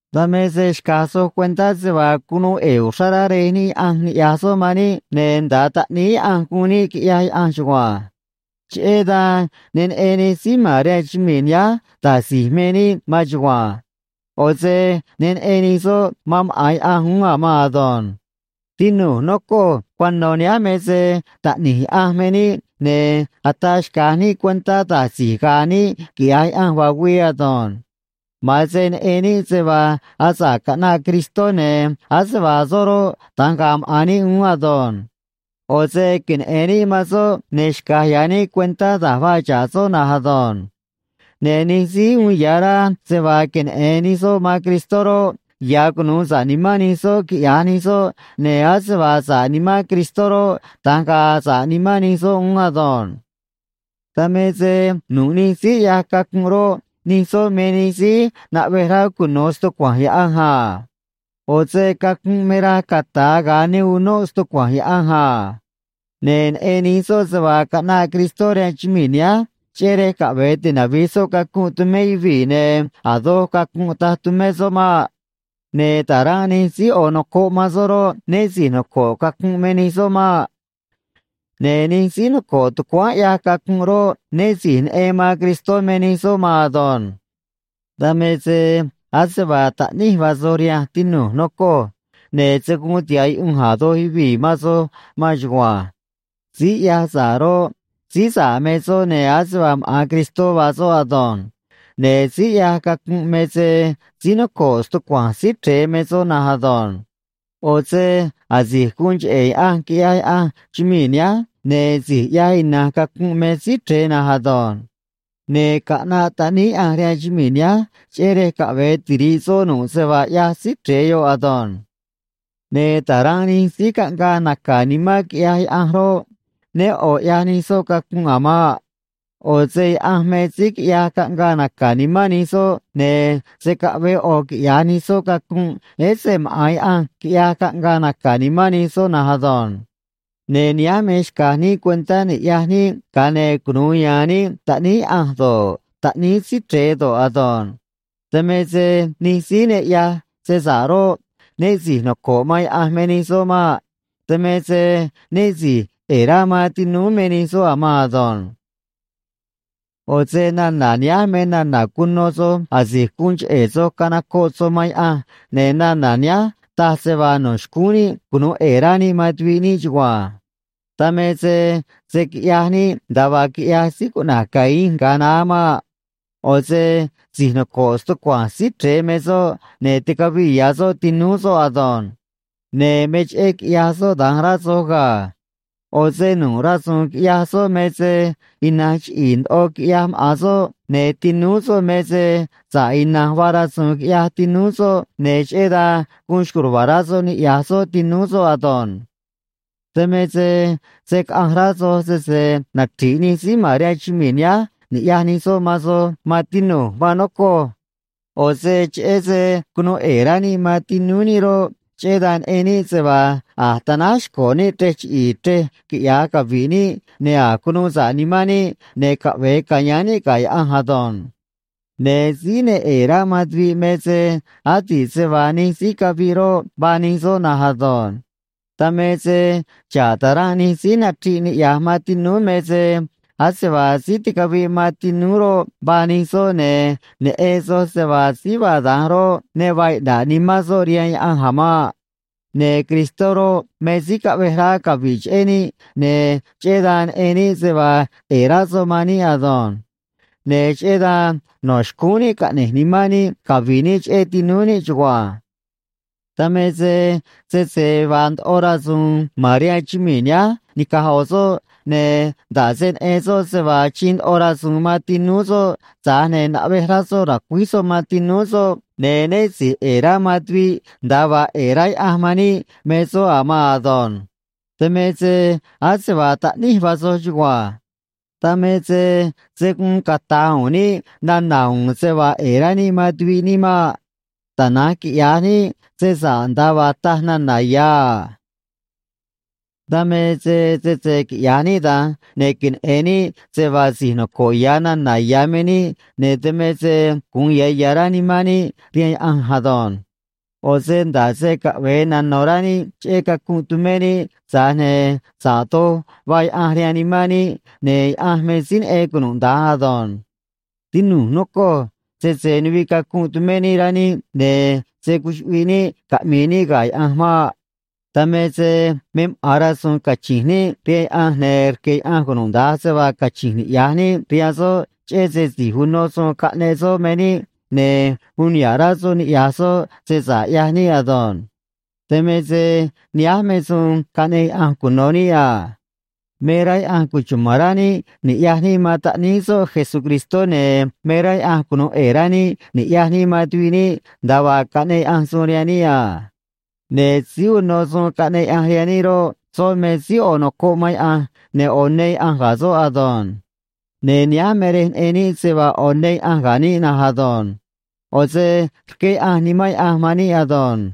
Dan me se xca̱j soj cuentá se vaa cunuu ꞌe̱e̱ uxrá rá Rej níꞌ Yaꞌanj niꞌya̱j soꞌ man níꞌ, ne̱ nda̱a taꞌníí Yaꞌanj guun níꞌ, quiꞌyaj Yaꞌanj chugua̱nj. Cheꞌé dan ne neꞌen nij síí ma̱n rihaan chumii̱ nihánj da̱j si̱j me níꞌ maan chugua̱nj. ꞌO̱ se ne neꞌen nij soꞌ man maꞌa̱n Yaꞌanj uún a̱ maan ado̱nj. Tinu̱j, nocoj, cuano̱ nihánj me se taꞌni̱j Yaꞌanj me níꞌ, ne̱ ataa xca̱j níꞌ cuentá da̱j si̱j ga̱a̱ níꞌ quiꞌya̱j Yaꞌanj vaa güii ado̱nj. Ma̱an se neꞌen níꞌ se vaa asa̱ꞌ caꞌnaꞌ Cristó, ne̱ ase vaa soꞌ roꞌ, da̱nj ga̱a̱ maꞌa̱n níꞌ uún ado̱nj. ꞌO̱ se queneꞌe̱n níꞌ man soꞌ, ne̱ xca̱j ya̱ níꞌ cuentá da̱j vaa xa̱ꞌ soꞌ na̱nj ado̱nj. Ne̱ nij síí uun ya̱ rá se vaa queneꞌe̱n nij soꞌ man Cristó roꞌ, ya̱ cunu̱u sa̱ꞌ nimán nij soꞌ quiꞌya̱j nij soꞌ, ne̱ ase vaa sa̱ꞌ nimán Cristó roꞌ, da̱nj ga̱a̱ sa̱ꞌ nimán nij soꞌ uún ado̱nj. Dan me se nu̱ꞌ nij síí ꞌyaj cacunꞌ roꞌ, nij soꞌ me nij síí naꞌvej rá cuno̱ stucua̱nj Yaꞌanj a. ꞌO̱ se cacunꞌ me raj cata̱a ga̱a ne unóꞌ stucua̱nj Yaꞌanj a. Ne̱ neꞌen nij soj se vaa caꞌnaꞌ Cristó rihaan chumii̱ nihánj, cheꞌé rej caꞌve̱e tinavi̱j soꞌ cacunꞌ tumé yuvii̱, ne̱ a̱ doj cacunꞌ taj tumé soꞌ maꞌ. Ne̱ ta̱ranꞌ nij síí ꞌo̱ nocoꞌ man soꞌ roꞌ, né si̱j noco̱ꞌ cacunꞌ me nij soꞌ maꞌ. Ne̱ nij síí noco̱ꞌ tucuáán ꞌyaj cacunꞌ roꞌ, né si̱j neꞌen man Cristó me nij soꞌ maan ado̱nj. Dan me se ase vaa taꞌníj vaa soj rihanj, tinu̱j, nocoj, ne̱ se̱ guun tiha̱ꞌ yuꞌunj a̱ doj yuvii̱ man soj maan chugua̱nj. Síí ꞌyaj sa̱ꞌ roꞌ, síí sa̱ꞌ me soꞌ, ne̱ ase vaa maꞌa̱n Cristó vaa soꞌ ado̱nj. Ne̱ síí ꞌyaj cacunꞌ me se síí noco̱ꞌ stucua̱nj Síí Chre̱e me soꞌ na̱nj ado̱nj. ꞌO̱ se asi̱j guun cheꞌe̱ Yaꞌanj quiꞌyaj Yaꞌanj chumii̱ nihánj, ne̱ si̱j ꞌyaj ina̱nj cacunꞌ me Síí Chre̱e na̱nj ado̱nj. Ne̱ caꞌnaꞌ Taꞌníí Yaꞌanj rihaan chumii̱ nihánj, cheꞌé rej caꞌve̱e tiri̱ꞌ soꞌ nu̱ꞌ se vaa ꞌyaj Síí Chre̱e yoꞌ ado̱nj. Ne̱ ta̱ranꞌ nij síí caꞌngaa naca̱ nimán quiꞌyaj Yaꞌanj roꞌ, né ꞌo̱ ꞌyaj nij soꞌ cacunꞌ a̱ maꞌ. ꞌO̱ se Yaꞌanj me síí quiꞌyaj caꞌngaa naca̱ nimán nij soꞌ, ne̱ se̱ caꞌvee ꞌo̱ quiꞌya̱j nij soꞌ cacunꞌ, ese maꞌa̱n Yaꞌanj quiꞌyaj caꞌngaa naca̱ nimán nij soꞌ na̱nj ado̱nj. Ne̱ nihánj me xca̱j níꞌ cuentá ni̱ꞌyaj níꞌ, ga̱a ne̱ cunu̱u ya̱a̱n níꞌ taꞌníí Yaꞌanj do̱ꞌ, taꞌníí Síí Chre̱e do̱ꞌ ado̱nj. Dan me se nij síí ne ꞌyaj se sa̱ꞌ roꞌ, né si̱j noco̱ꞌ man Yaꞌanj me nij soꞌ maꞌ. Dan me se né si̱j ꞌe̱e̱ rá man tinúú me nij soꞌ a̱ maan ado̱nj. ꞌO̱ se nana̱ nihánj me nana̱ cuno soj asi̱j guun cheꞌe̱ soj canocoꞌ soj man Yaꞌanj, ne̱ nana̱ nihánj taj se vaa no̱ xcúún níꞌ cunu̱u ꞌe̱e̱ rá níꞌ man tuviꞌ níꞌ chugua̱nj. Dan me se se̱ quiꞌyaj níꞌ nda̱a vaa quiꞌyaj síí cuꞌna̱j Caín ga̱a naá maꞌ. ꞌO̱ se si̱j noco̱ꞌ stucua̱nj Síí Chre̱e me soꞌ, ne̱ ticaviꞌ ya̱ soꞌ tinúú soꞌ ado̱nj. Ne̱ me cheꞌé quiꞌyaj soꞌ da̱nj, rá soj ga̱. ꞌO̱ se nu̱ꞌ rasu̱u̱n quiꞌyaj soꞌ me se ina̱nj chiꞌi̱i̱ ndoꞌo quiꞌyaj maꞌa̱n soꞌ, ne̱ tinúú soꞌ me se sa̱ꞌ ina̱nj vaa rasu̱u̱n quiꞌyaj tinúú soꞌ, ne̱ cheꞌé dan guun xco̱j ruva̱a̱ rá soꞌ niꞌya̱j soꞌ tinúú soꞌ ado̱nj. Dan me se se̱ caꞌanj rá soj sese nachri̱ꞌ nij síí ma̱n rihaan chumii̱ nihánj ni̱ꞌyaj nij soꞌ man soj, maan tinu̱j, maan nocoj. ꞌO̱ se cheꞌé se cunuu ꞌe̱e̱ rá níꞌ man tinúú níꞌ roꞌ, cheꞌé dan neꞌen níꞌ se vaa a̱j tanáj xco̱ níꞌ chrej chiꞌi̱i̱ chrej quiꞌya̱j cavi̱ꞌ níꞌ, ne̱ a̱j cunuu sa̱ꞌ nimán níꞌ, ne̱ caꞌve̱e ca̱yáán níꞌ ga̱ Yaꞌanj ado̱nj. Ne̱ síí ne ꞌe̱e̱ rá man tuviꞌ me se adi̱ꞌ se vaa nij síí caviꞌ roꞌ, vaa nij soꞌ na̱nj ado̱nj. Dan me se xa̱ꞌ ta̱ranꞌ nij síí nachriꞌ niꞌya̱j man tinúú me se ase vaa síí ticaviꞌ man tinúú roꞌ, vaa nij soꞌ, ne̱ neꞌen soj se vaa síí vaa da̱nj roꞌ, ne vaa iꞌna̱ꞌ nimán soꞌ rihaan Yaꞌanj a̱ maꞌ. Ne̱ Cristó roꞌ, me síí caꞌvej rá cavi̱ꞌ cheꞌé níꞌ, ne̱ cheꞌé dan neꞌen níꞌ se vaa ꞌe̱e̱ rá soꞌ man níꞌ ado̱nj. Ne̱ cheꞌé dan no̱ xcúún níꞌ caꞌne̱j nimán níꞌ cavi̱ꞌ níꞌ cheꞌé tinúú níꞌ chugua̱nj. Dan me se sese vaa ndoꞌo rasu̱u̱n ma̱n rihaan chumii̱ nihánj ni̱caj ꞌo̱ soꞌ, ne̱ nda̱ꞌ se neꞌen soꞌ se vaa achiin ndoꞌo rasu̱u̱n man tinúú soꞌ tza̱j ne̱ naꞌvej rá soꞌ ra̱cuíj soꞌ man tinúú soꞌ, ne̱ né si̱j ꞌe̱e̱ rá man tuviꞌ nda̱a vaa ꞌe̱e̱ rá Yaꞌanj man níꞌ me soꞌ a̱ maan ado̱nj. Dan me se ase vaa taꞌníj vaa soj chugua̱nj. Dan me se se̱ guun cata̱j u̱u̱n níꞌ nana̱ u̱u̱n se vaa ꞌe̱e̱ rá níꞌ man tuviꞌ níꞌ maꞌ. Tana̱nj quiꞌya̱j níꞌ se sa̱ꞌ nda̱a vaa taj nana̱ ya̱ a. Dan me se sese quiꞌya̱j níꞌ da̱nj, ne̱ queneꞌe̱n níꞌ se vaa si̱j noco̱ꞌ ya̱ nana̱ ya̱ me níꞌ, ne̱ dan me se gu̱un ya̱ ya̱ rá nimán níꞌ rihaan Yaꞌanj ado̱nj. ꞌO̱ se nda̱ꞌ se caꞌve̱e nano̱ rá níꞌ cheꞌé cacunꞌ tumé níꞌ, tza̱j ne̱ sa̱ꞌ doj vaa Yaꞌanj rihaan nimán níꞌ, ne̱ Yaꞌanj me síí neꞌen cunuda̱nj ado̱nj. Tinu̱j, nocoj, sese nuviꞌ cacunꞌ tumé níꞌ rá níꞌ, ne̱ se̱ cuchuꞌviꞌ níꞌ caꞌmi̱i̱ níꞌ ga̱ Yaꞌanj maꞌ. Dan me se me maꞌa̱n rasu̱u̱n cachi̱nj níꞌ rihaan Yaꞌanj, ne̱ rque̱ Yaꞌanj cunuda̱nj se vaa cachi̱nj niꞌya̱j níꞌ rihaan soꞌ, cheꞌé se si̱j uno suun caꞌneꞌ soꞌ me níꞌ, ne̱ uun niha̱ꞌ rá soꞌ niꞌya̱j soꞌ se sa̱ꞌ ꞌyaj níꞌ ado̱nj. Dan me se nihánj me suun caꞌneꞌ Yaꞌanj cuno̱ níꞌ a. Me rá Yaꞌanj cuchuma̱n rá níꞌ ni̱ꞌyaj níꞌ man Taꞌníí soꞌ Jesucristó, ne̱ me rá Yaꞌanj cunu̱u ꞌe̱e̱ rá níꞌ ni̱ꞌyaj níꞌ man tuviꞌ níꞌ nda̱a vaa caꞌneꞌ Yaꞌanj suun rihaan níꞌ a. Ne̱ síí uno suun caꞌneꞌ Yaꞌanj rihaan níꞌ roꞌ, soꞌ me síí ꞌo̱ nocoꞌ man Yaꞌanj, ne̱ ꞌo̱ ne Yaꞌanj ga̱ soꞌ ado̱nj. Ne̱ nihánj me rej neꞌen níꞌ se vaa ꞌo̱ ne Yaꞌanj ga̱ níꞌ na̱nj ado̱nj. ꞌO̱ se rqué Yaꞌanj Nimán Yaꞌanj man níꞌ ado̱nj.